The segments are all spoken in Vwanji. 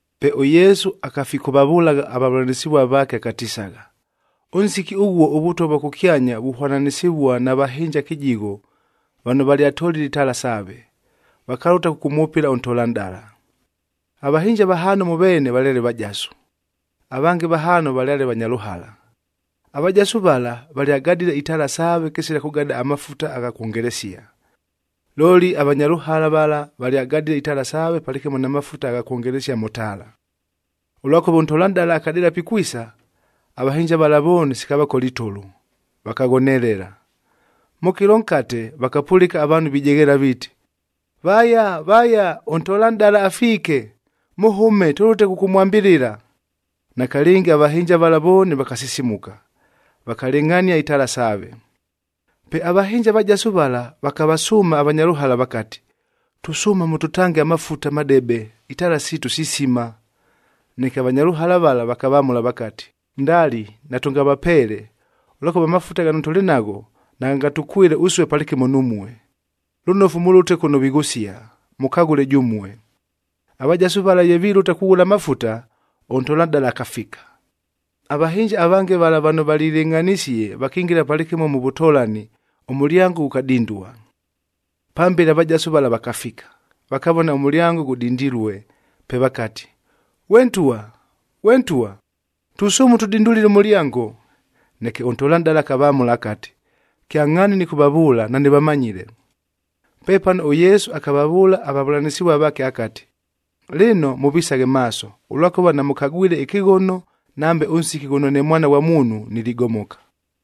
Pe ʉYesu akafikʉvavʉlagha avavʉlanɨsɨvua vaake akatisagha, “Ʉnsiki ʉghuo ʉVʉtwa vwa kʉkyanya vuhwananɨsɨvua na vahɨnja kɨjigho vano valyatolile itaala saave, vakalʉta kʉkʉmwʉpɨla ʉntolanʼdala. Avahɨnja vahaano mʉ veene valyale vajasu, avange vahaano valyale vanya lʉhala. Avajasu vala, valyagadile itaala saave kɨsila kʉgada amafuta agha kwongelesia. Looli avanya lʉhala vala valyagadile itaala saave palɨkɨmo na mafuta agha kwongelesia mʉ taala. Ʉlwakʉva ʉntolanʼdala akadɨɨla pikwisa, avahɨnja vala vooni sikavakola itʉlʉ, vakaghonelela. Mʉ kɨlo nkate, vakapʉlɨka avaanhu vijegheela viiti, ‘Vaya, vaya! Ʉntolanʼdala afiike, mʉhʉme tʉlʉte kʉkʉmwambɨlɨla.’ Nakalɨngi avahɨnja vala vooni vakasisimuka, vakalɨngʼhania itaala saave. “Pe avahɨnja avajasu vala vakavasʉʉma avanya lʉhala vakati, ‘Tusʉʉma mʉtʉtange amafuta madebe, itaala siitu sisima.’ Neke avanya lʉhala vala vakavamʉla vakati, ‘Ndali! Natʉngavapeele, ʉlwakʉva amafuta ghano tʉlɨ nagho, naghangatʉkwɨle ʉsue palɨkɨmo numue. Lʉnofu mʉlʉte kʉno vighʉsia, mʉkaghʉle jʉmue.’ Avajasu vala ye vilʉta kughʉla amafuta, ʉntolanʼdala akafika. Avahɨnja avange vala vano valilɨngʼhanisie, vakingila palɨkɨmo mʉ vʉtolani, ʉmʉlyango ghʉkadindua. “Pambele avajasu vala vakafika, vakavona ʉmʉlyango ghʉdindilue, pe vakati, ‘Ghwe ntwa! Ghwe ntwa! Tusʉʉma ʉtʉdindulile ʉmʉlyango!’ Neke ʉntolanʼdala akavamʉla akati, ‘Kyangʼhaani nɨkʉvavʉʉla, nanɨvamanyile!’” Pepano ʉYesu akavavʉʉla avavʉlanɨsɨvua vaake akati, “Lɨno, mʉvisaghe maaso, ʉlwakʉva namʉkagwile ɨkɨghono nambe ʉnsiki ghʉno ne Mwana ghwa Muunhu niligomoka.”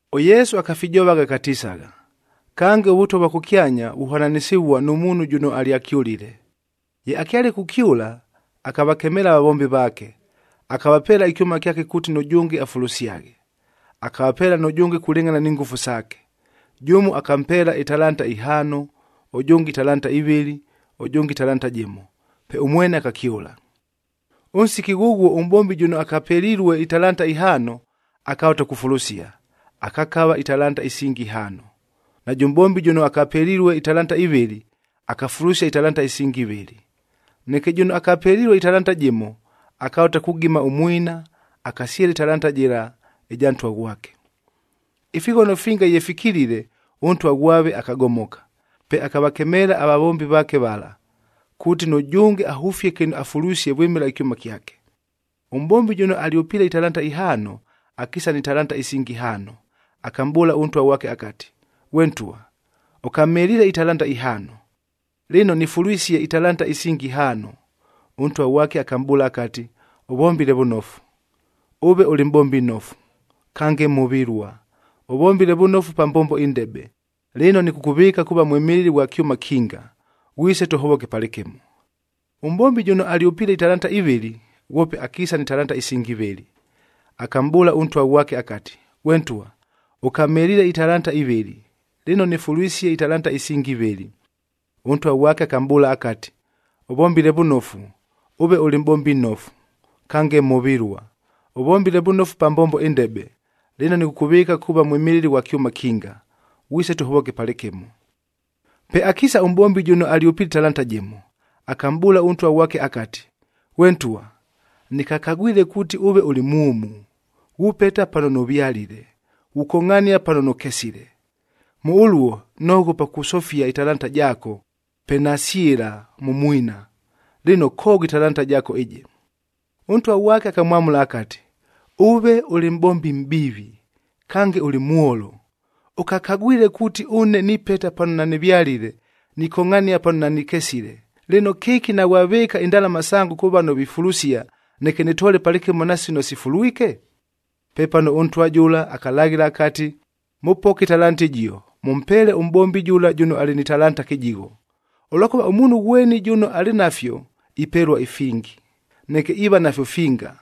ɄYesu akafijovagha akatisagha, “Kange, ʉVʉtwa vwa kʉkyanya vuhwananɨsɨvua nʉ muunhu jʉno alyakyʉlile. Ye akyale kukyʉla, akavakemeela avavombi vaake, akavapeela ɨkyʉma kyake kuuti nʉjʉnge afulusyaghe. Akavapeela nʉjʉnge kulɨngʼhana ni ngʉfu saake. Jʉmo akampeela italantaa ihaano, ʉjʉnge italanta ivɨlɨ, ʉjʉnge ɨtalanta jɨmo, pe ʉmwene akakyʉla. “Ʉnsiki ghʉghuo ʉmʼbombi jʉno akapelilue italanta ihaano, akalʉta kufulusia, akakava italanta isingi ihaano. Najʉ mʼbombi jʉno akapelilue italanta ivɨlɨ, akafulusia italanta isingi ivɨlɨ. Neke jʉno akapelilue ɨtalanta jɨmo, akalʉta kugima ʉmwina, akasyɨla ɨtalanta jɨla ɨja ntwa ghwake. “Ifighono finga ye fikilile, ʉntwa ghwave akagomoka. Pe akavakemeela avavombi vaake vala, kuuti nʉjʉnge ahʉfie kɨno afulwisie vwɨmɨla ɨkyʉma kyake. Ʉmʼbombi jʉno alyʉpiile italanta ihaano, akiisa ni talanta isingi ihaano. Akamʼbʉʉla ʉntwa ghwake akati, ‘Ghwe ntwa, ʉkamheliile italanta ihaano, lɨno nɨfulwisie italanta isingi ihaano.’ Ʉntwa ghwake akamʼbʉʉla akati, ‘Ʉvombile vʉnofu. Ʉve ʉlɨ mʼbombi nnofu, kange mhʉvɨlua! Ʉvombile vʉnofu pa mbombo ɨndebe, lɨno nɨkʉkʉvɨɨka kuuva mwɨmɨlɨli ghwa kyʉma kinga. Ghwise tʉhovoke palɨkɨmo.’ “Ʉmʼbombi jʉno alyʉpiile italanta ivɨlɨ, ghwope akiisa ni talanta isingi ivɨlɨ. Akamʼbʉʉla ʉntwa ghwake akati, ‘Ghwe ntwa, ʉkamheliile italanta ivɨlɨ, lɨno nɨfulwisie italanta isingi ivɨlɨ.’ Ʉntwa ghwake akamʼbʉʉla akati, ‘Ʉvombile vʉnofu. Ʉve ʉlɨ mʼbombi nnofu, kange mhʉvɨlua! Ʉvombile vʉnofu pa mbombo ɨndebe, lɨno nɨkʉkʉvɨɨka kuuva mwɨmɨlɨli ghwa kyʉma kinga. Ghwise tʉhovoke palɨkɨmo.’ “Pe akiisa ʉmʼbombi jʉno alyʉpiile ɨtalanta jɨmo, akamʼbʉʉla ʉntwa ghwake akati, ‘Ghwe ntwa, nɨkakagwile kuuti ʉve ʉlɨ mwʉmu, ghupeta pano nʉvyalile, ghukongʼhania pano nʉkesile. Mʉ ʉluo, noghopa kusofia ɨtalanta jaako, pe nasyɨla mʉ mwina. Lɨno, koogho ɨtalanta jaako ɨjɨ.’ Ʉntwa ghwake akamwamʉla akati, ‘Ʉve ʉlɨ mʼbombi mʼbiivi, kange ʉlɨ mwolo! Ʉkakagwile kuuti ʉne nipeta pano nanɨvyalile, nikongʼhania pano nanɨkesile, lɨno kɨki naghwavɨɨka indalama sango kʉ vano vifulusia, neke nɨtoole palɨkɨmo na sino sifulwike?’ “Pepano ʉntwa jʉla akalaghɨla akati, ‘Mʉpoke ɨtalanta ɨjio, mʉmpeele ʉmʼbombi jʉla jʉno alɨ ni talanta kɨjigho. Ʉlwakʉva ʉmuunhu ghweni jʉno alɨ nafyo ipelua ifingi, neke iiva nafyo finga.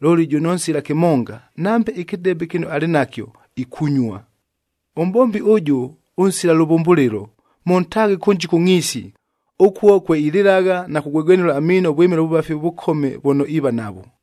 Looli jʉno nsila kɨmonga, nambe ɨkɨdebe kɨno alɨ nakyo, ikunyua. Ʉmʼbombi ʉjʉ ʉnsila lʉvʉmbʉlɨlo, mʉntaaghe kʉnji kʉ ngʼhiisi, ʉkuo kwe ilɨlagha na kugwegwenʉla amiino vwɨmɨla ʉvʉvafi ʉvʉkome vʉno iiva navwo.’”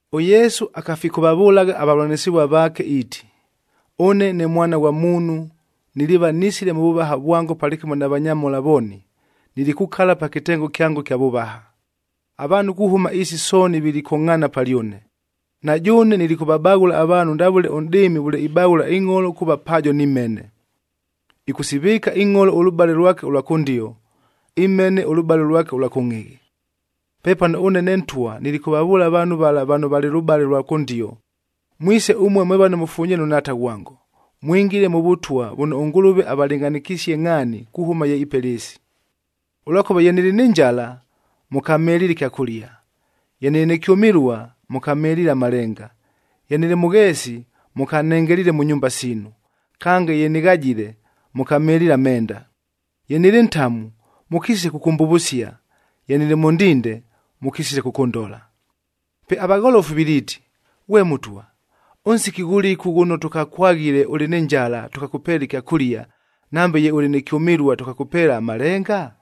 ɄYesu akafikʉvavʉlagha avavʉlanɨsɨvua vaake iiti, “Ʉne ne Mwana ghwa Muunhu niliiva nisile mʉ vʉvaha vwango palɨkɨmo na vanyamhola vooni, nilikukala pa kɨtengo kyango ɨkya vʉvaha. Avaanhu kuhʉma ɨɨsi sooni vilikongʼhaana palyʉne. Na jʉʉne nilikʉvabaghʉla avaanhu ndavʉle ʉnʼdɨɨmi vʉle ibaghʉla ingʼholo kuuva paajo ni mhene. Ɨkʉsivɨɨka ingʼholo ʉlʉbale lwake ʉlwa kʉndio, imhene ʉlʉbale lwake ʉlwa kʉngʼhɨghɨ. “Pepano ʉne ne Ntwa nilikʉvavʉʉla avaanhu vala vano valɨ lʉbale ʉlwa kʉndio, ‘Mwise ʉmue mwe vano mʉfunyilue nʉ Nhaata ghwango, mwingile mʉ vʉtwa vʉno ʉNgʉlʉve avalɨngʼhanɨkisie ngʼhaani kuhʉma ye ipela ɨɨsi. Ʉlwakʉva ye nɨlɨ nɨ njala, mʉkamheliile ɨkyakʉlia; ye nɨlɨ nɨ kyʉmɨlua, mʉkamheliile amalenga; ye nɨlɨ mʉgheesi, mʉkanhengeliile mʉ nyumba siinu. Kange ye nɨghajile, mʉkamheliile amenda; ye nɨlɨ ntamu, mʉkisile kʉkʉmbʉvʉsia; ye nɨlɨ mʉ ndinde, mʉkisile kʉkʉndola.’ “Pe avagholofu viliiti, ‘Ghwe Mʉtwa, ʉnsiki ghʉlɨku ghʉno tʉkakwaghile ʉlɨ nɨ njala tʉkakʉpeela ɨkyakʉlia, nambe ye ʉlɨ nɨ kyʉmɨlua, tʉkakʉpeela amalenga?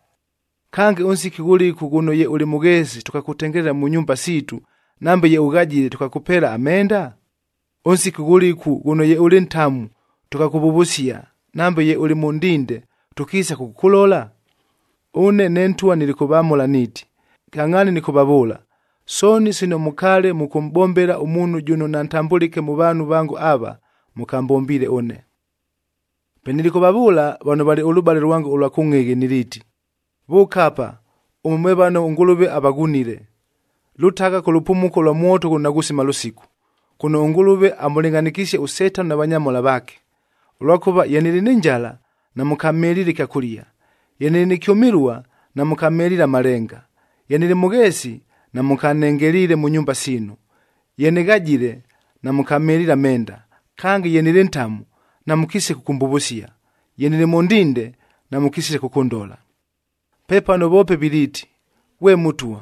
Kange, ʉnsiki ghʉlɨku ghʉno ye ʉlɨ mʉgheesi, tʉkakʉtengelela mʉ nyumba siitu; nambe ye ʉghajile, tʉkakʉpeela amenda? Ʉnsiki ghʉlɨku ghʉno ye ʉlɨ ntamu, tʉkakʉvʉvʉsia; nambe ye ʉlɨ mʉ ndinde, tʉkiisa kʉkʉkʉlola?’ Ʉne ne Ntwa nilikʉvamʉla niiti, ‘Kyangʼhaani nɨkʉvavʉʉla, sooni sino mʉkaale mʉkʉmʼbombela ʉmuunhu jʉno nantambʉlɨke mʉ vaanhu vango ava, mʉkambombiile ʉne.’ “Pe nilikʉvavʉʉla vano valɨ lʉbale lwango ʉlwa kʉngʼhɨghɨ niliiti, ‘Vʉʉka apa ʉmue mwe vano ʉNgʉlʉve avaghunile! Lʉtagha kʉ lʉpumuko lwa mwoto ghʉno naghusima lʉsiku, kʉno ʉNgʉlʉve amʉlɨngʼhanɨkisie ʉSetano na vanyamhola vaake. Ʉlwakʉva ye nɨlɨ nɨ njala, namʉkamheliile ɨkyakʉlia; ye nɨlɨ nɨ kyʉmɨlua, namʉkamheliile amalenga; ye nɨlɨ mʉgheesi, namʉkanhengeliile mʉ nyumba siinu; ye nɨghajile, namʉkamheliile amenda. Kange, ye nɨlɨ ntamu, namʉkisile kʉkʉmbʉvʉsia; ye nɨlɨ mʉ ndinde, namʉkisile kʉkʉndola.’ “Pepano voope viliiti, ‘Ghwe Mʉtwa,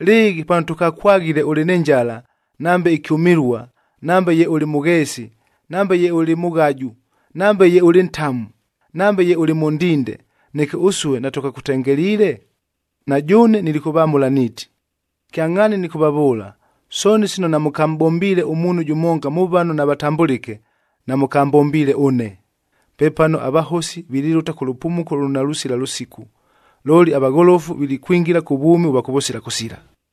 lɨɨghi pano tʉkakwaghile ʉlɨ nɨ njala, nambe ɨkyʉmɨlua, nambe ye ʉlɨ mʉgheesi, nambe ye ʉlɨ mʉghaju, nambe ye ʉlɨ ntamu, nambe ye ʉlɨ mʉ ndinde, neke ʉsue natʉkakʉtengeliile?’ Na jʉʉne nilikʉvamʉla niiti, ‘Kyangʼhaani nɨkʉvavʉʉla, sooni sino namʉkamʼbombiile ʉmuunhu jʉmonga mʉ vano navatambʉlɨke, namʉkambombiile ʉne.’ Pepano avahosi vililʉta kʉ lʉpumuko lʉno nalusila lʉsiku. Looli avagholofu vilikwingila kʉ vwʉmi ʉvwa kʉvʉsila kʉsila.”